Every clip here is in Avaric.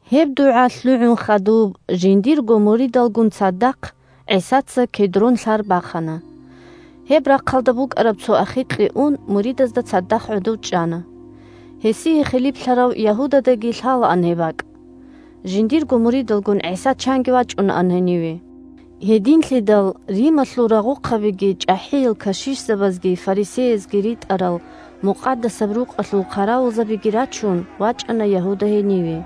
Гьеб дугӀа лъугӀун хадуб, жиндирго муридалгун цадахъ, ГӀисаца Кедрон лъар бахана. Гьеб рахъалда букӀараб цо ахикье ун, муридазда цадахъ гӀодов чӀана. Гьесие хилиплъарав Ягьудадаги лъалаан гьеб бакӀ. Жиндирго муридалгун ГӀиса чанги вачӀунаан гьениве. Гьединлъидал Рималъул рагъухъабиги чӀахӀиял кашишзабазги фарисеязги ритӀарал Мукъадасаб Рукъалъул хъаравулзабиги рачун вачӀана Ягьуда гьениве.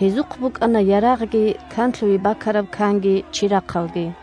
Гьезухъ букӀана ярагъги, канлъуе бакараб канги, чирахъалги.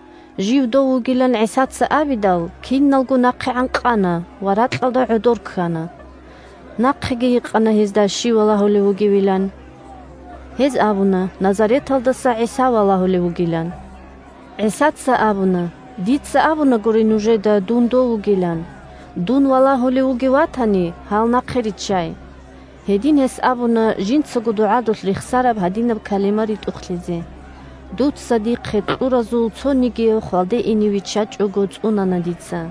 Жив Дов вугилан ГӀисаца абидал, киналго нахъегӀан къана ва ракьалда гӀодор ккана. Нахъеги гьикъана гьезда щив валагьулев вугевилан. Гьез абуна Назареталдаса ГӀиса валагьулев вугилан. ГӀисаца абуна: – Дица абунагури нужеда дун Дов вугилан. Дун валагьулев вугев ватани, гьал нахъе риччай. (Гьедин гьес абуна жинцаго дугӀадулъ рехсараб гьадинаб калима ритӀухълъизе: «Дуца дихъе кьуразул цонигияв хвалде ине виччачӀого цӀунана дица».)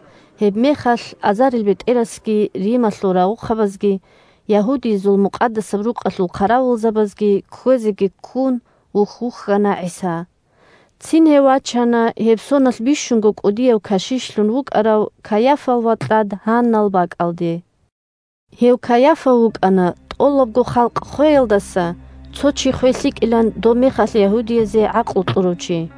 Гьебмехалъ азарилбетӀерасги, Рималъул рагъухъабазги, ягьудиязул Мукъадасаб Рукъалъул хъаравулзабазги, кквезеги ккун, вухь-вухьана ГӀиса. Цин гьев вачана гьеб соналъ бищунго кӀудияв кашишлъун вукӀарав Кайафал вакьад Гьаннал бакӀалде. Гьев Кайафа вукӀана тӀолабго халкъ хвеялдаса цо чи хвей лъикӀилан добмехалъ ягьудиязе гӀакълу кьурав чи.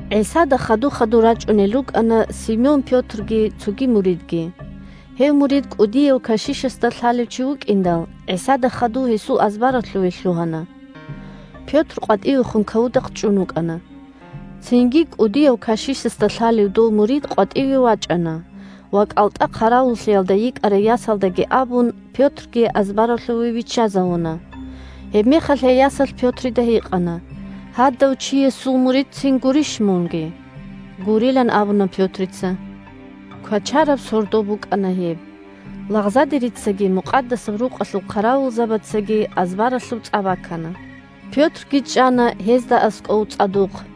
ГӀисада хаду-хадур рачӀунел рукӀана Симон Пётрги цоги муридги. Гьев мурид кӀудияв кашишасда лъалев чи вукӀиндал, ГӀисада хадув гьесул азбаралъуве лъугьана. Пётр къватӀивехун кавудахъ чӀун вукӀана. Цинги кӀудияв кашишасда лъалев дов мурид къватӀиве вачӀана ва, кӀалтӀа хъаравуллъиялда йикӀарай ясалдаги абун, Пётрги азбаралъуве виччазавуна. Гьебмехалъ гьей ясалъ Пётрида гьикъана: – Гьадав чиясул муридцин гурищ мунги? Гурилан абуна Пётрица. Квачараб сордо букӀана гьеб. Лагъзадерицаги Мукъадасаб Рукъалъул хъаравулзабацаги азбаралъуб цӀа бакана. Пётрги чӀана гьезда аскӀов цӀадухъ.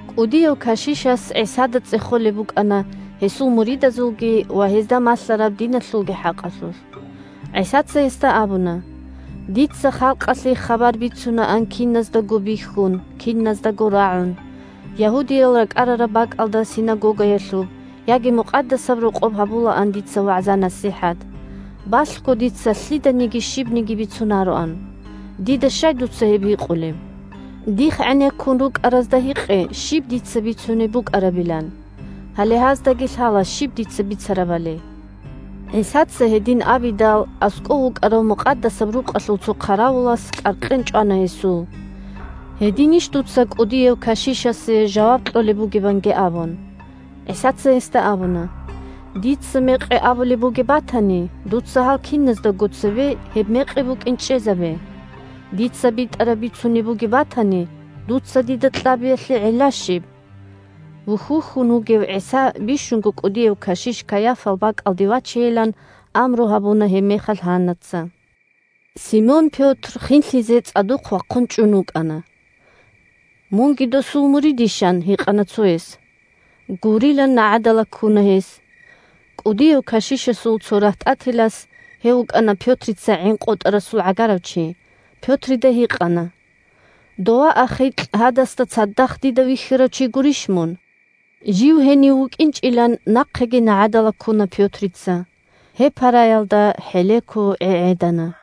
КӀудияв кашишас ГӀисада цӀехолеб букӀана гьесул муридазулги ва гьезда малъараб диналъулги хӀакъалъулъ. ГӀисаца гьесда абуна: – Дица халкъалъе хабар бицунаан киназдаго бихьун, киназдаго рагӀун. Ягьудиял ракӀарараб бакӀалда синагогаялъуб яги Мукъадасаб Рокъоб гьабулаан дица вагӀза-насихӀат. Балъго дица лъиданиги щибниги бицунароан. Дида щай дуца гьеб гьикъулеб? Дихъ гӀенеккун рукӀаразда гьикъе щиб дица бицунеб букӀарабилан. Гьале гьаздаги лъала щиб дица бицарабали. ГӀисаца гьедин абидал, аскӀов вукӀарав Мукъадасаб Рукъалъул цо хъаравулас кӀаркьен чӀвана гьесул: – Гьединищ дуца кӀудияв кашишасе жаваб кьолеб бугеб? – анги абун. ГӀисаца гьесда абуна: – Дица мекъи абулеб бугеб батани, дуца гьал киназдаго цебе гьеб мекъи букӀин чӀезабе. Дица битӀараб бицунеб бугеб батани, дуца дида кьабиялъе гӀилла щиб? Вухь-вухьун вугев ГӀиса бищунго кӀудияв кашиш Кайафал бакӀалде вачейилан амру гьабуна гьебмехалъ Гьаннаца. Симон Пётр хинлъизе цӀадухъ вахъун чӀун вукӀана. – Мунги досул муридищ? – ан гьикъана цояс. Гурилан нагӀадала ккуна гьес. КӀудияв кашишасул цо рагьтӀателас (гьев вукӀана Пётрица гӀин къотӀарасул гӀагарав чи) Пётрида гьикъана: – Дова ахикь гьадасда цадахъ дида вихьарав чи гурищ мун? Жив гьенив вукӀинчӀилан нахъеги нагӀадала ккуна Пётрица. Гьеб параялда хӀелеко гӀегӀедана.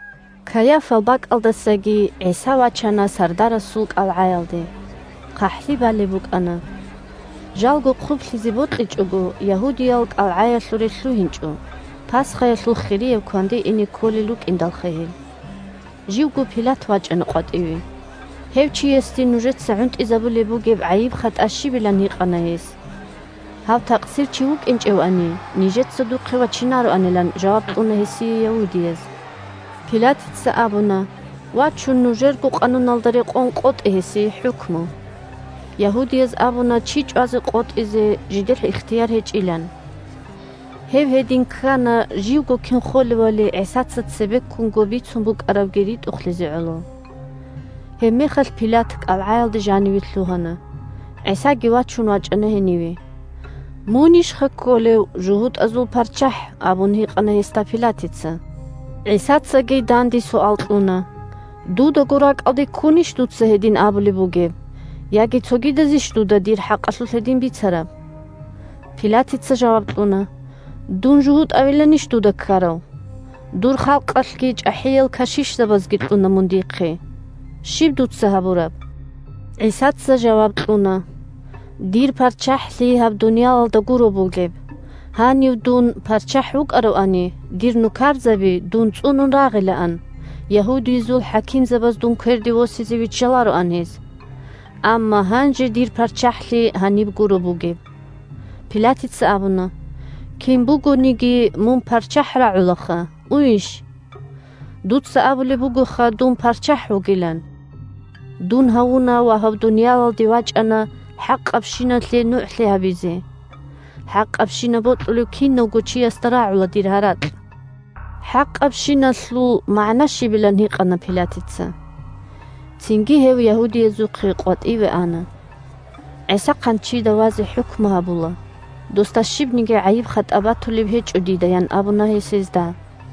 Кайафал бакӀалдасаги ГӀиса вачана сардарасул кӀалгӀаялде. ХъахӀлъи балеб букӀана. Жалго хъублъизе бокьичӀого, ягьудиял кӀалгӀаялъуре лъугьинчӀо, Пасхаялъул хирияб кванде ине кколел рукӀиндалха гьел. Живго Пилат вачӀана къватӀиве. Гьев чиясде нужеца гӀунтӀизабулеб бугеб гӀайиб-хатӀа щибилан гьикъана гьес. Гьав такъсирчи вукӀинчӀевани, нижеца духъе вачинароанилан жаваб кьуна гьесие ягьудияз. Пилатица абуна: – Вачун нужерго къануналда рекъон къотӀе гьесие хӀукму. Ягьудияз абуна чи чӀвазе къотӀизе жидер ихтияр гьечӀилан. (Гьеб гьедин ккана живго кин холевали ГӀисаца цебеккунго бицун букӀарабги ритӀухълъизе гӀоло.) Гьебмехалъ Пилат кӀалгӀаялда жаниве лъугьана. ГӀисаги вачун вачӀана гьениве. – Мунищха кколев жугьутӀазул парччахӀ? – абун гьикъана гьесда Пилатица. ГӀисацаги данде суал кьуна: – Дудаго ракӀалде ккунищ дуца гьедин абулеб бугеб, яги цогидазищ дуда дир хӀакъалъулъ гьедин бицараб? Пилатица жаваб кьуна: – Дун жугьутӀавиланищ дуда ккарав? Дур халкъалъги чӀахӀиял кашишзабазги кьуна мун дихъе. Щиб дуца гьабураб? ГӀисаца жаваб кьуна: – Дир ПарччахӀлъи гьаб дуниялалда гуро бугеб. Гьанив дун ПарччахӀ вукӀаравани, дир нукарзаби дун цӀунун рагъилаан, ягьудиязул хӀакимзабаз дун кверде восизе виччалароан гьез. Амма гьанже дир ПарччахӀлъи гьаниб гуро бугеб. Пилатица абуна: – Кин бугониги мун ПарччахӀ рагӀулаха. Уйищ? – Дуца абулеб бугоха дун ПарччахӀ вугилан. Дун гьавуна ва гьаб дуниялалде вачӀана хӀакъабщиналъе нугӀлъи гьабизе. ХӀакъабщинаб бокьулев кинавго чиясда рагӀула дир гьаракь. «ХӀакъабщиналъул» магӀна щибилан гьикъана Пилатица. Цинги гьев ягьудиязухъе къватӀиве ана. ГӀиса хъанчида вазе хӀукму гьабула – Досда щибниги гӀайиб-хатӀа батулеб гьечӀо дида, – ян абуна гьес гьезда. –